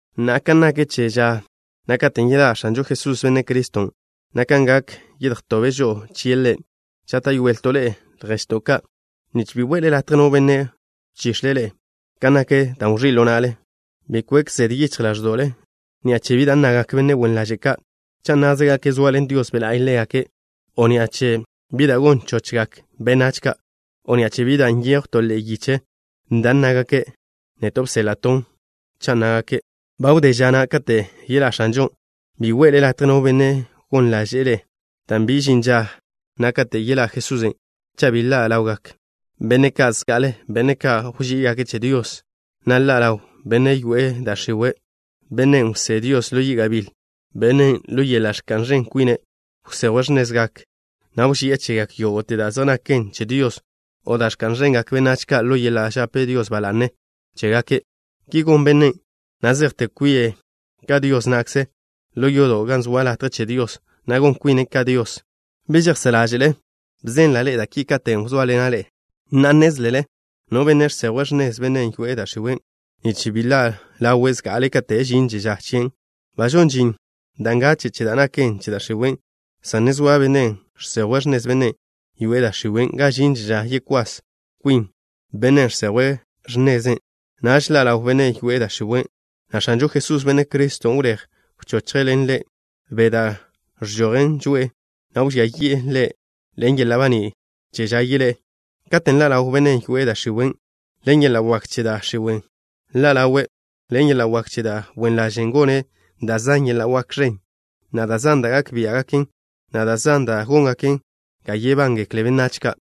Na'a, kan nak che ža na' katen' yeḻá' X̱anžo Jesús, Benne' Criston', na' kan gak, yedjtobe' žo'o chie' Ḻe', žáta'yoelto' ḻe'e, lježto' ka', nich bi we'le latje no benne' wchix̱e' ḻe'e kan nak da' wẕí' ḻo na'le. Bi kwek zede yichj ḻáẕdo'le ni'a che bi da' nnagak benne' wen ḻaže' ka', cha' nnázegake' zoaḻen Dios Be' La'y ḻégake', o ni'a che bi da' gon chochgak benách ka', o ni'a che bi da' nyejw to ḻe'e yiche da' nnágake' neto' bséḻa'ton', cha' nnágake': “Ba wdé ža na' kate' yeḻá' X̱anžon'.” Bi we'le latje no benne' gon ḻáže'le' ḻe'e, dan' bi žin ža na' kate' yeḻá' Jesusen' cha' bi ḻa' ḻawgak benne' zan zga'ale, benne' ka' wží'igake' che Dios, na' ḻa' ḻaw bennen' yoe'e da' x̱iwe', bennen' wsé Dios ḻo yi' gabíl. Bennen', ḻo yeḻa' ẕka'n ẕen kwine', wsejwe' x̱nezgak, na' wži'e chegak yógo'te da' zej naken che Dios o da' ẕka'n ẕengak benách ka' ḻo yeḻa' žape Dios ba la'ne chégake'. Ki gon bennen' na' zejte kwi'e ka Dios na'kze ḻo yodo' gan zoa latje che Dios, na' gon kwine' ka Dios. ¿Bi žejsá' ḻáže'le bzenla' ḻe'e da' ki katen' wzóaḻena' ḻe'e? Na'a, nnézlele no Benne' žsejwe' x̱nez bennen' yoe'e da' x̱iwe', nich bi ḻa' ḻawe' zga'ale kate' žinže ža chien'. Ba žon žin da' ngache' che da' naken che da' x̱iwe', san ne zoa Bennen' žsejwe' x̱nez bennen' yoe'e da' x̱iwe' ga žinže ža yekwás kwin Bennen' žsejwe' x̱neze'. Naž ḻa' ḻaw benne' yoe'e da' x̱iwe', na' X̱anžo Jesús, Benne' Criston', wléj wchochje' ḻe' ḻen be' da' ẕžojen žoe'e, na' wžía yi'e ḻe' ḻen yeḻa' baní' che ža yeḻé'e. Katen' ḻa' ḻaw bennen' yoe'e da' x̱iwe', ḻen yeḻa' wak che da' x̱iwe' ḻa' ḻawe'. Ḻen yeḻa' wak che da' wen ḻaže' gone' da' zan yeḻa' wak ẕen, na' da' zan da' gak biá'gaken, na' da' zan da' góngaken ga yebángekle benách ka'.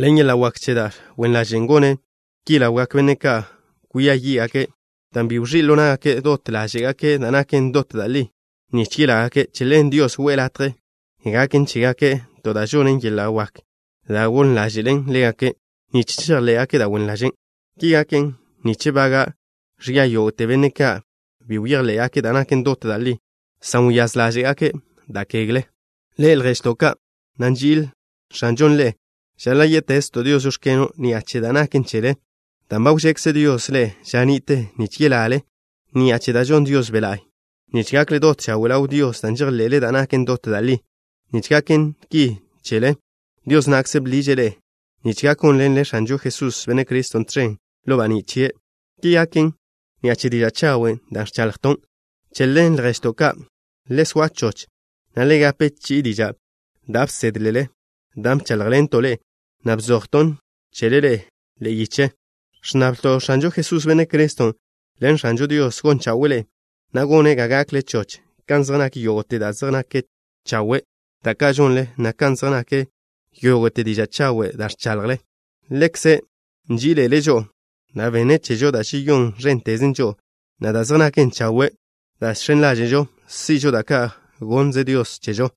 Ḻen yeḻa' wak che da' wen ḻaže' gone' ki ḻawgak benne' ka' kwia yí'gake' dan' bi wẕí' ḻo ná'gake' dot ḻáže'gake' da' naken dot da' li, nich yelágake'. Che ḻen Dios we'e latje gaken chégake' to da' žonen yeḻa' wak da' gon ḻáže'len ḻégake' nich chejḻé'gake' da' wen ḻažen'. Ki gaken nich bága'gak ẕia yógo'te benne' ka' bi bejḻé'gake' da' naken dot da' li, san wyáz ḻáže'gake' da' kegle. Ḻe'e, lježto' ka', na' nži'il X̱anžon' ḻe'e, žaḻa' yé'tezto' Dios: “Žóx̱keno'” ni'a che da' naken chele, dan' ba wžekze Dios ḻe'e ža ni'te nich yelale ni'a che da' žon Dios Be' La'y, nich gakle dot chawe' ḻaw Dios, dan' žejḻe'le da' naken dot da' li. Nich gaken ki chele, Dios na'kze bḻiže' ḻe'e, nich gak gónḻenle X̱anžo Jesús, Benne' Criston' tẕen ḻo baní' chie'. Ki gaken ni'a che diža' chawen' da' ẕchaḻjton'. Che ḻen, lježto' ka', le soa choch, na' le gape chi'i diža' da' bsédlele, dan' bcháḻjḻento' ḻe'e, na' bzojton' chele ḻe'e yiche. Ẕnnablto' X̱anžo Jesús, Benne' Criston' ḻen X̱ažo Dios, gon chawe'e ḻe'e, na' gone' ga gakle choch kan zej nak yógo'te da' zej naken chawe', da' ka' žonle, na' kan zej nak yógo'te diža' chawen' da' ẕchaḻjle. Ḻekze' nži'ile' žo'o, na' benne' chežo da' žeyón ẕénteze žo'o, na' da' zej naken chawe' da' žx̱en ḻáže'žo si'žo, da' ka' gonnze Dios chežo.